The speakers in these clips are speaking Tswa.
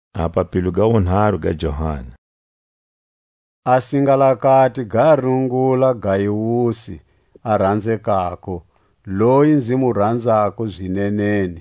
A ku famba hi zinene. A singalakati ga rungula Gaiusi a ranzekako, loyi nzi mu ranzako zineneni.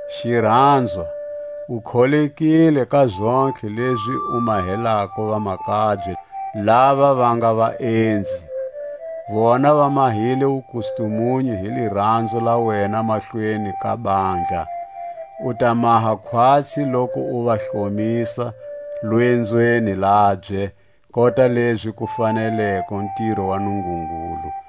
Xiranzwa, u kholekile ka zontlhe lezi u mahelako vamakabye lava va nga vaenzi. Vona va mahile wukustumunyu hi liranzo la wena mahlweni ka bandla. U ta maha khwatsi loku u va hlomisa lwenzweni labye kota lezi ku faneleko ntiro wa Nungungulu.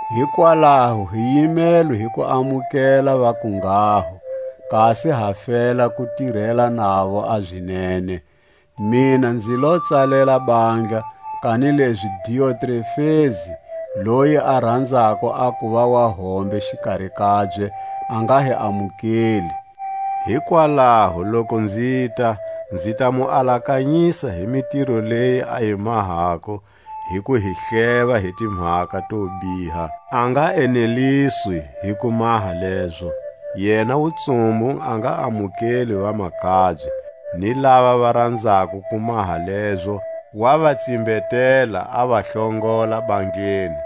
Hikwalaho hi yimelwe hi ku amukela va kunghaho, kasi ha fela ku tirela navo a zinene. Mina nzi lo tsalela bandla, kanilezi Diotrefesi, loyi a ranzako a kuva wahombe xikari kabye, a nga hi amukeli. Hikwalaho loku nzita, nzi ta mu alakanyisa hi mitiro leyi a yi mahako hi ku hi hleva hi timhaka to biha. A nga eneliswi hi ku maha lezo, yena wutsumbu a nga amukeli vamakabye, ni lava va ranzako ku maha lezo wa va tsimbetela, a va hlongola bandleni.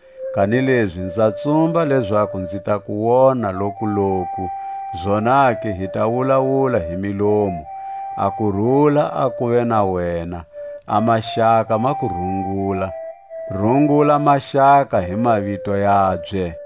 Kanilezi nza tsumba lezaku nzi ta ku wona lokuloku, zonake hi ta wulawula hi milomu. A kurula a kuve na wena. A maxaka ma ku rungula. Rungula maxaka hi mavito yabye.